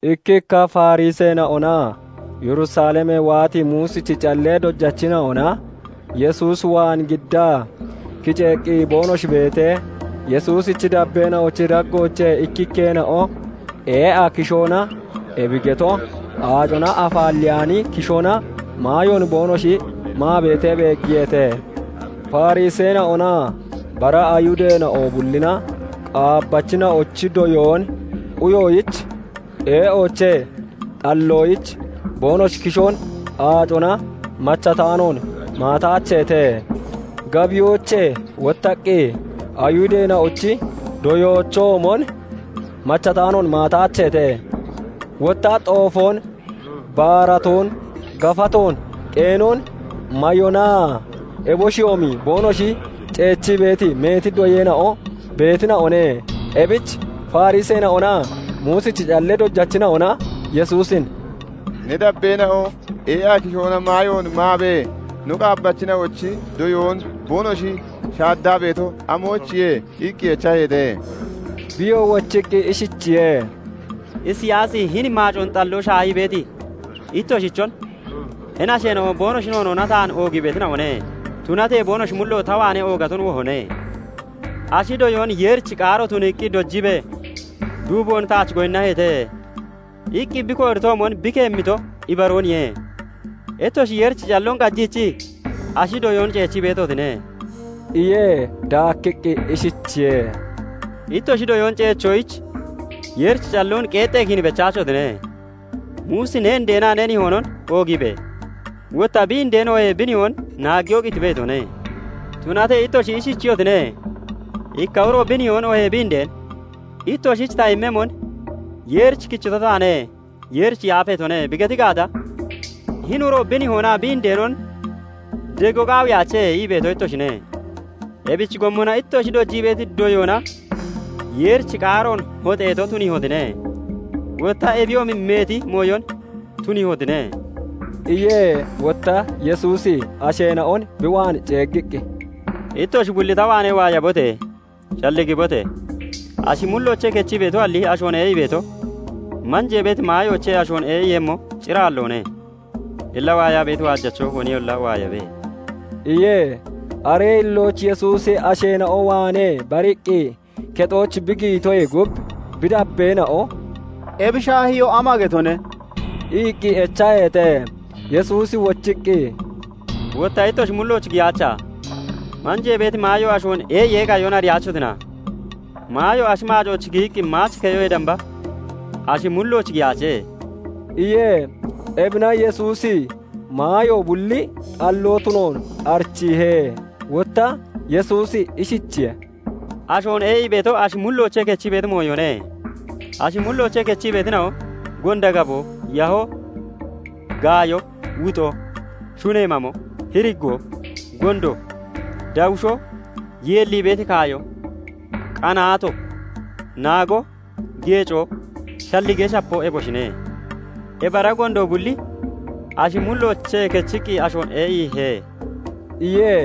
Ikkikka Fariseena'onaa Yerusalemee waati Muusichi callee dojachina'ona Yesuus waan giddaa kiceeqqi boonoshi beetee, Yesuusichi dabbeena'ochi daggoochee ikkikkeena'o ee'a kishoona, ebi geto aacona afaalleyaani kishoona maayoon boonoshi maa beetee beeggiyeete. Fariseena'onaa bara Ayhudeena'o bullina qaabbaachina'ochi doyoon quyoyich ee'oochee xalloyich boonoshi kishoon aacona machataanoon maataacheete. Gabiyoochee wottaqqi Ayihudeena'ochi doyoochoomon machataanoon maataacheete. Wotta xoofoon, baaratoon, gafatoon, [qeenon] mayonaa eboshiyoomi boonoshi ceechi beeti meeti doyeena'o beetina'one. Ebich Fariseena'onaa Muusichi callee dojachina'ona Yesuusin "Ne dabbeena'o ee'a kishoona maayoon maabee, no qaabbachina'ochi doyoon boonoshi shaaddaa beeto amoyichiye? iqqi echaheete. Biyoo wochiqqi ishichiye:- "Isiyaasi hini maacoon xalloo shaahii beeti ittoshichon 'Hini asheena'o boonoshi noonoona taan oogii beetina'one; tunatee boonoshi mullo ta waanee oogaton wohone. Ashi doyoon Yeerichi qaaro tuniiqqi dojiibee, duuboon taach gooyinnaheete' iqqi bi kooritoomon bi keemmito ibarooniye. Ittoshi Yeerichi calloon qajiichii ashi doyoon ceechi beetotine" iye. Daakkiqqi ishichiye:- "Ittoshi doyoon ceechoyich Yeerichi calloon qeexxee kiin bechaachotine. Muusi 'Ne indeenaa ne nihoonon oogiibe!' wotta 'Bi indeen oohee bi nihoon naaggiyoo qitibe!' itone. Tunatee ittoshi ishichiyotine:- 'Ikka uro bi nihoon oohee bi indeen "Ittoshich ta immemmon Yeerich kichito taane; Yeerich yaafeetone" bi geti gaata, Hini uro bi nihoonaa bi indeenon dego qaawiyaache' ii beeto ittoshine. Ebichi gommona ittoshi dojii beeti doyoona Yeerichi qaaroon hoxeeto tuniihotine. Wotta ebiyoomi meeti mooyon tuniihotine" iye. Wotta Yesuusi asheena'on bi waan ceeggiqqi, "Ittoshi bulli ta waanee waayabote! Shalligibote! Ashi mulloochee kechii beetoalli ashoon ee'ii beeto, manjee beeti maayoochee ashoon ee'iiyemmo cir aalloone [. Illa waayaa beeti waajacho koniyolla waayabe]" iye. Aree hillooch Yesuusi asheena'o waanee bariqqi kexooch bi giyitoyee gub, bi dabbeena'o "Ebi shaahiyoo ama getone?" iqqi echaheete. Yesuusi wochiqqi, "Wotta ittoshi mulloochoo giyaacha? Manjee beeti maayo ashoon ee'iyee qayon ariyaachotina? Maayo ashi maacooch giyiqqi maach keyoyee damba, ashi mullooch giyaache" iye. Ebina Yesuusi maayo bulli xalloo tunoon arichiihe. Wotta Yesuusi ishichiye:- "Ashoon ee'ii beeto ashi mulloochee kechii beeti mooyone. Ashi mulloochee kechii beetina'o, gonda gaboo, yahoo, gaayo, wuxoo, Shunee mamo, hiriggoo, gondo, dawishoo, yeellii beeti kaayo, qanaato, naago, geecoo, shalligee shapoo, eboshine. Ebi ara gondo bulli ashi mulloochee kechiqqi ashoon ee'iihe" iye.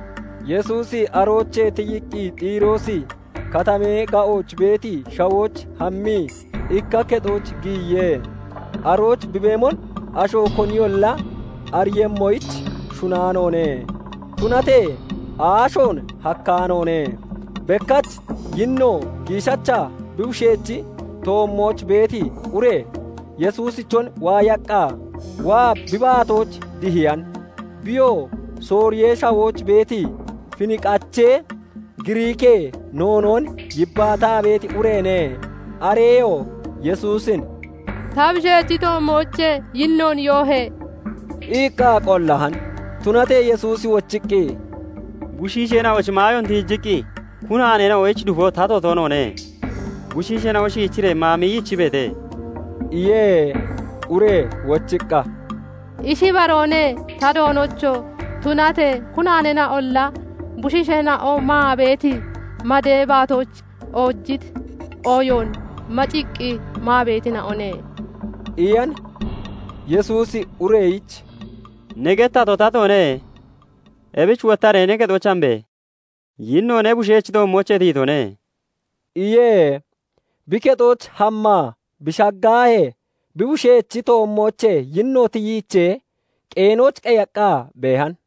Yesuusi aroochee tiyiqqi Xiroosi Katamee ga'ooch beeti shawooch hammii ikka kexooch giyiye. Arooch bi beemon asho koniyolla ariiyemmoyich shunaanoone; tunatee aashoon hakkaanoone. Bekkach yinno giishacha bi bushechi toommooch beeti ure Yesuusichon waayaqqa waa bi baatooch dihiyan. Biyoo Sooriyee Shawooch beeti Finqache, Giriikee noonoon yibbaataa beeti ureene. Areyoo Yesuusin "Ta bushechi toommoochee yinnoon yoohe!" iqqa qollahan. Tunatee Yesuusi wochiqqi, "Bushiisheena'ochi maayoon tiijiqqi kunaaneena'oyich dufo tato toonoone; bushiisheena'o shiichiree maa miyichibeete" iye. Ure wochiqqa, "Ishi ibaroone, ta Doonocho! tunatee kunaaneena'olla bushiisheena'o maa beeti madee baatooch oojiti ooyoon maciqqi maa beetina'one" iyan. Yesuusi ureyichi "Ne gettato tatoone. Ebich wottaree ne kexooch hambe! Yinno ne bushechi toommoochee tiyitone" iye. Bi kexooch hammaa bi shaggahee, bi bushechi toommoochee yinno tiyiichee qeenooch qeyaqqa beehan.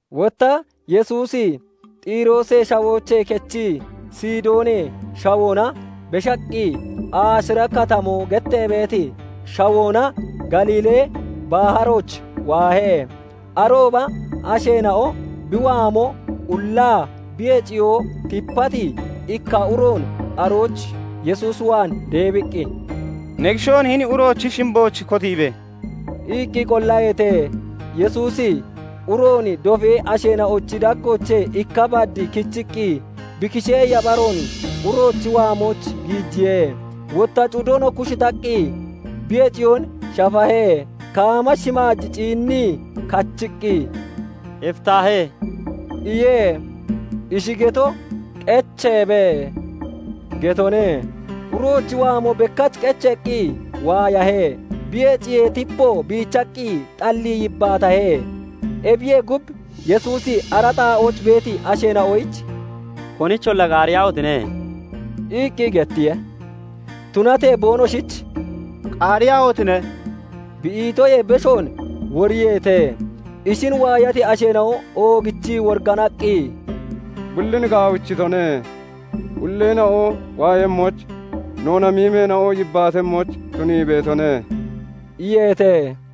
Wotta Yesuusi Xiroosee shawooche kechii Sidoonee shawoona beshaqqi, aashira Katamoo gettee beeti shawoona Galiilee baharooch waahe. Arooba asheena'o bi waamo ullaa bi heciyoo tipati ikka uroon arooch Yesuus waan deebiqqi, "Ne kishoon hini uroochi shimbooch kotiibe!" iqqi qollaheete. Yesuusi uroon dofee asheena'ochi daggoochee ikka bad kichiqqi bi kishee yapharoon (yabaroon) uroochi waamooch giijiye. Wotta cudon kushitaqqi (kuujiiqqi) bi heciyoon shafahe. Kaama shimaaj ciinnii kachiqqi, "Eftahe!" iye. Ishi geto, "Qecheebe!" getone. Uroochi waamo bekkach qecheeqqi waayahe; bi heciyee tipo biichaqqi xallii yibbaatahe. Ebiyee gub, Yesuusi ara xaa'ooch beeti asheena'oyich "Konicholla qaariyaahotine!" iqqi gettiye. Tunatee boonoshich "Qaariyaahotine!" bi itoyee beshoon woriyeete. Ishin waayati asheena'o oogichii woriganaqqi, "Bullin gaawichitone; ulleena'o waayemmoyich, noona miimeena'o yibbaatemmoyich tunii beetone" iyeete.